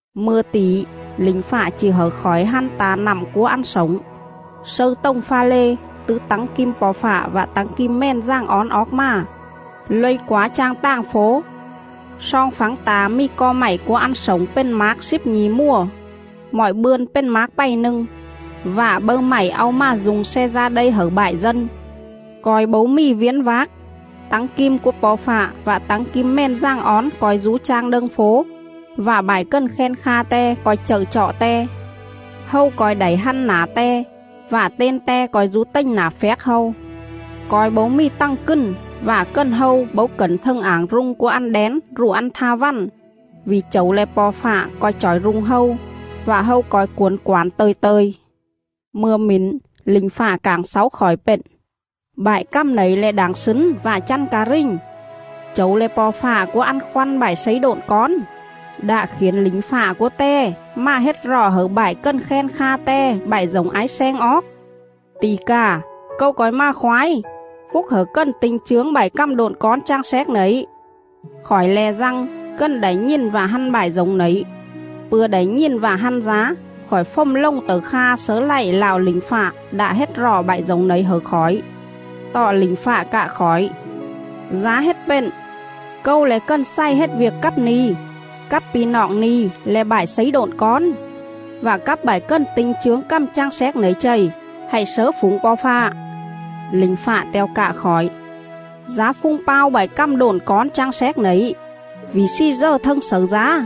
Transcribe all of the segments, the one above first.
Mư̱a tỉ lỉnh fạ chỉ hẩư khỏi hăn ta̱ nặm cúa ăn slổng, slâư tồng pha lê, tứ tắng kim Po̱ Fạ vạ tắng kim Mèn Dàng Ón oóc mà,. luây quá chang tàng fố. Sloong phắng ta̱ mì co mạy cúa ăn slổng pền mác slíp nhi̱ mùa, mọi bươn pền mác pày nâng; vạ bâư mạy au mà du̱ng sle da đây hẩư bại dân.. Co̱i bấu mì viến vác. Tắng kim cúa Po̱ Fạ vạ tắng kim Mèn Dàng Ón co̱i dú chang đâng fố, vạ bại cần khen kha Te co̱i chậư chọ Te.. Hâu co̱i đảy hăn nả Te, vạ ten Te co̱i dú tềnh nả phjác hâu. Co̱i bấu mì tằng cừn vạ cần hâu bấu cẩn thâng ảng rung cúa ăn đén rụ ăn tha vằn, vỉ Chẩu le̱ Po̱ Fạ co̱i chỏi rung hâu. Vạ hâu co̱i cuổn quản tơ̱i tơ̱i.. Mư̱a mển lỉnh fạ cảng xáu khỏi pện: “Bại cằm nẩy le̱ đảng slứn vạ chăn ca rình. Chẩu le̱ Po̱ Fạ cúa ăn khoăn bại slấy độn cón, đạ khiển lỉnh fạ cúa Te mà hết rọ hẩư bại cần khen kha Te bại dổng ái sleng oóc. Tỉ cà, Câu co̱i mà khoái. Phúc hẩư cần ti̱nh chướng bại cằm độn cón chang xéc nẩy!” Khỏi le̱ Dăng, cần đảy nhìn vạ hăn bại dổng nẩy. Pư̱a đảy nhìn vạ hăn dá, khỏi fồm lồng tẩư kha slớ lạy lạo lỉnh fạ đạ hết rọ bại dổng nẩy hẩư khỏi. Tọ lỉnh fạ cạ khỏi: “Dá hết pện! Câu le̱ cần xày hết viêc cắp ni̱, cắp pi̱ noọng ni̱ le̱ bại slấy độn cón, vạ cắp bại cần ti̱nh chướng cằm chang xéc nẩy chầy. Hạy slớ phủng Po̱ Fạ.” Lỉnh fạ te̱o cạ khỏi: “Dá phung pao bại cằm độn cón chang xéc nẩy vỉ slì dờ thâng xẩư dá.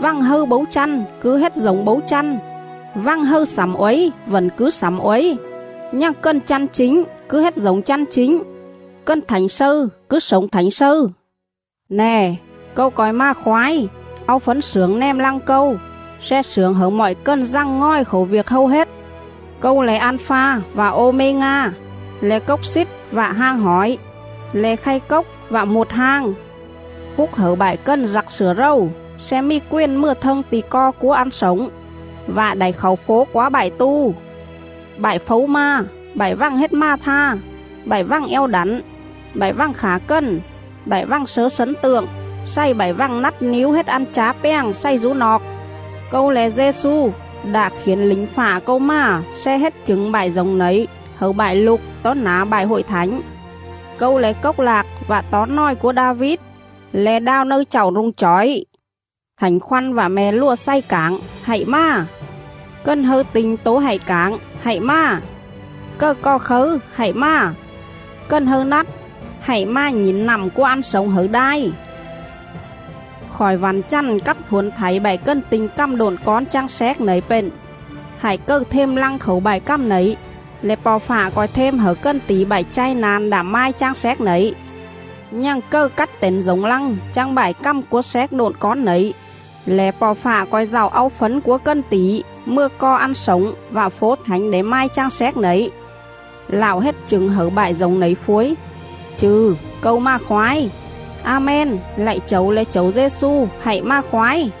Vằng hâư bấu chăn cứ hết dổng bấu chăn, vằng hâư slẳm uối vẩn cứ slẳm uối, nhằng cần chăn chính cứ hết dổng chăn chính, cần thảnh slâư cứ slổng thảnh slâư!”. “Nè, Câu co̱i mà khoái, au fấn slưởng nèm lăng Câu, sle slưởng hẩư mọi cần dằng ngòi khảu viêc hâu hết.. Câu le̱ An-pha vạ Ô-mê-nga, le̱ Cốc Xít vạ Hang Hỏi, le̱ Khay Cốc vạ Muột Hang.”. Phúc hẩư bại cần dặc slửa rầu sle mì quền mừa thâng ti̱ co cúa ăn slổng, vạ đảy khảu fố quá bại tu.. Bại phấu ma, bại vằng hết ma̱ tha, bại vằng eo đẳn, bại vằng khả cần, bại vằng slớ slấn tượng, xày bại vằng nắt níu hết ăn chá pjàng xày dú noọc. “Câu le̱ Dê-xu, đạ khiển lỉnh fạ Câu mà sle hết chửng bại dổng nẩy hẩư bại lục tó nả bại Hội Thảnh. Câu le̱ Cốc Lạc vạ Tó Nòi cúa Đa-vít, le̱ Đao Nâư Chạu rung chỏi.”. Thảnh Khoăn vạ Me̱ Lùa xày cảng: “Hạy mà!” Cần hâư ti̱nh tố hạy cảng: “Hạy mà!” Cầư cò khấư, hạy mà! Cần hâư nắt, hạy mà nhỉn nặm cúa ăn slổng hẩư đai.. Khỏi vẳn chằn cắp thuổn thảy bại cần ti̱nh cằm độn cón chang xéc nẩy pện: Hại cầư them lăng khảu bại cằm nẩy, lẻ Po̱ Fạ co̱i them hẩư cần tỉ bại chai na̱n đạ mai chang xéc nẩy.. Nhằng cầư cắt tẩn dổng lăng chang bại cằm cúa xéc độn cón nẩy, lẻ Po̱ Fạ co̱i dạu au fấn cúa cần tỉ mừa co ăn slổng vạ fố thảnh đảy mai chang xéc nẩy. Lạo hết chửng hẩư bại dổng nẩy phuối: “Chư̱, Câu mà khoái.” A-men. Lạy Chẩu le̱ Chẩu Dê-xu, hạy mà khoái!